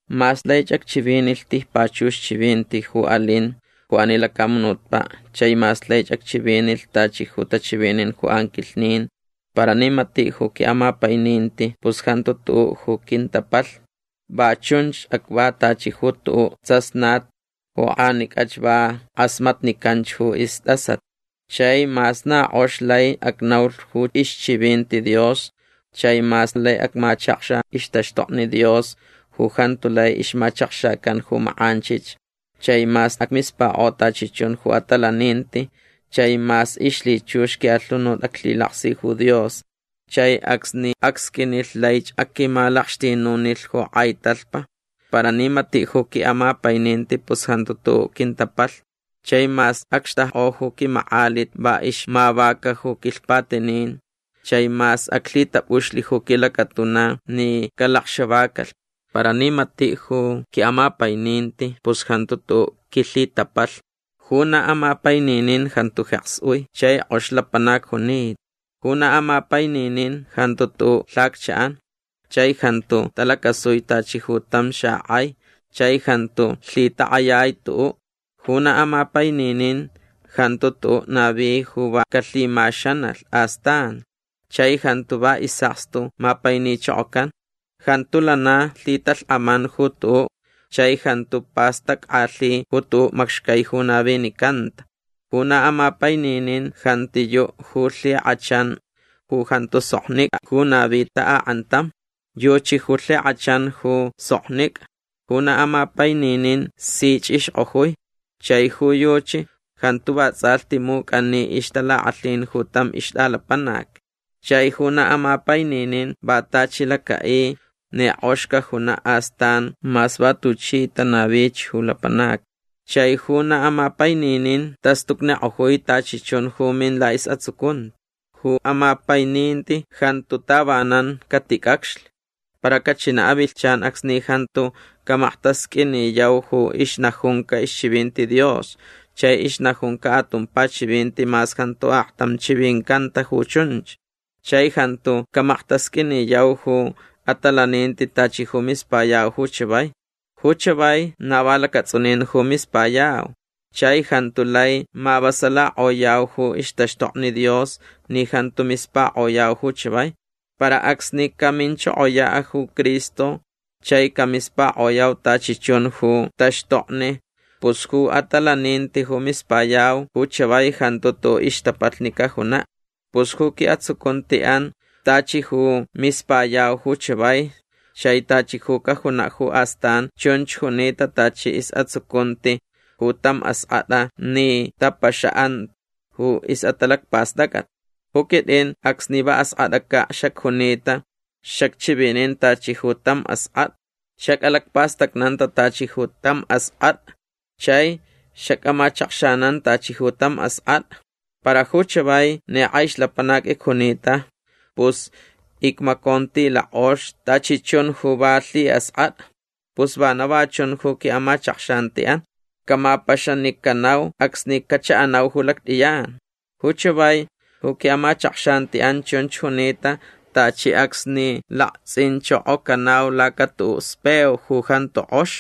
Mas laich acchivinilh tijpachux chivinti ju alin ju ani lacamunutpaʼ chai mas laich acchivinilh tachi ju tachivinin ju anquilhnin para ni matiʼ ju quiʼamapaininti pus jantu tuʼuʼ ju quintapalhni. Va chunch acva tachi ju tuʼuʼ tsasnat ju anicʼach va kʼasmatnicanch ju istʼasat. Chai mas na kʼox lai acnaulh ju ixchivinti Dios chai mas lai acmachakxa ixtaxtokni Dios ju jantu lai ixmachakxacan ju makʼanchich chai mas acmispakʼo tachi chun ju atalaninti chai mas ixlhichux quiʼalhunut aclhilaksi ju Dios chai acsni acsqʼuinilh laich aquimalakxtinunilh ju kʼai talhpa para ni matiʼ ju quiʼamapaininti pus jantu tuʼuʼ quintapalhni. Chai mas acxtakkʼo ju quimakʼalit va ixmavaca ju quilhpatinin chai mas aclhitapʼuxlh ju quilacatuna ni calacxavacalh para ni matiʼ ju quiʼamapaininti pus jantu tuʼuʼ quilhitapalhni. Ju na amapaininin jantu jeks ui. Chai kʼox lapanac junita. Ju na amapaininin jantu tuʼuʼ lhacchaʼan. Chai jantu talacasui tachi ju tam xakʼai chai jantu lhitakʼayai tuʼuʼ. Ju na amapaininin jantu tuʼuʼ navi ju va calhimaxanalh astan. Chai jantu va isʼakstu mapainichokocan. Jantu lana lhitalhkʼaman ju tuʼuʼ chai jantu pastackʼalhi ju tuʼuʼ macxcai ju navicanta. Ju na amapaininin jantiyuʼ ju lhikʼachan ju jantu soknicʼa ju navita akʼantam. Yuchi ju lhikʼachan ju soknicʼa. Ju na amapaininin si chʼixkʼojui. Chai ju yuchi jantu vatsʼalhti mucʼani ixtalakʼalhin ju tam ixtʼalapanac. Chai ju na amapaininin va tachi lacaʼi ni kʼox cajunaʼ astan mas va tuchi tanavich ju lapanacni. Chai ju na amapaininin tastucnikʼojui tachi chun ju min laʼisʼatsucunti. Ju amapaininti jantu tavanan caticʼacxlh. Para cachinaʼ avilhchan acsni jantu camaktasqʼuiniyau ju ixnajunca ixchivinti Dios chai ixnajunca atumpa chivinti mas jantu aktam chivincanta ju chunch. Chai jantu camaktasqʼuiniyau ju atalaninti tachi ju mispayau ju chavai. Ju chavai na va lacatsʼunin ju mispayau chai jantu lai mavasalakʼoyau ju ixtaxtokni Dios ni jantu mispakʼoyau ju chavai. Para acsni caminchokoyaʼ ju Cristo chai camispakʼoyau tachi chun ju taxtokni pus ju atalaninti ju mispayau ju chavai jantu tuʼuʼ ixtapalhni cajunaʼ. Pus ju quiʼatsucuntiʼan tachi ju mispayau ju chavai chai tachi ju cajunaʼ ju astan chunch junita tachi isʼatsucunti ju tam askʼatʼa ni tapaxaʼanta ju ixʼatalacpastʼacʼat. Ju quitʼin acsni va askʼatʼacaʼ xacjunita xacchivinin tachi ju tam askʼatʼa. Xacʼalacpastacnan tachi ju tam askʼatʼa. Chai xacʼamachakxanan tachi ju tam askʼatʼa. Para ju chavai ni kʼaich lapanac icjunita pus icmacontilakʼolhch tachi chun ju va lhiʼaskʼatʼa. Pus vana va chun ju quiʼamachakxantiʼan. Camapaxanicanau acsni cachaʼanau ju lactʼiyan. Ju chavai ju quiʼamachakxantiʼan chunch junita tachi acsni laktsʼinchokocanau laca tuʼuʼ speo ju jantu kʼox.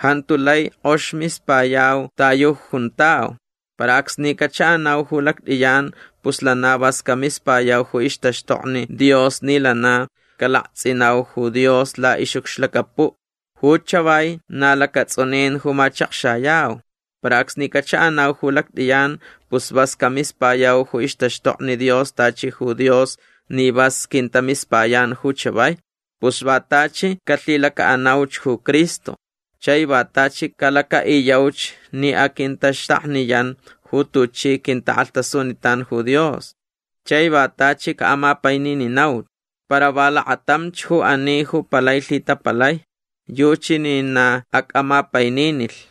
Jantu lai kʼox mispayau ta yu juntau. Para acsni cachaʼanau ju lactʼiyan pus lana vas camispayau ju ixtaxtokni Dios ni lana calaktsʼinau ju Dios laʼixʼucxlacapuʼ. Ju chavai na lacatsʼunin ju machakxayau. Para acsni cachaʼanau ju lactʼiyan pus vas camispayau ju ixtaxtokni Dios tachi ju Dios ni vas quintamispayan ju chavai. Pus va tachi calhilacaʼanauch ju Cristo. Chai va tachi calacaʼiyau ni aquintaxtakniyan ju tuchi quintakʼalhtasunitan ju Dios. Chai va tachi caʼamapainininau. Para va lakatamch ju ani ju palai lhitapalai. Yuchi ni na acʼamapaininilh.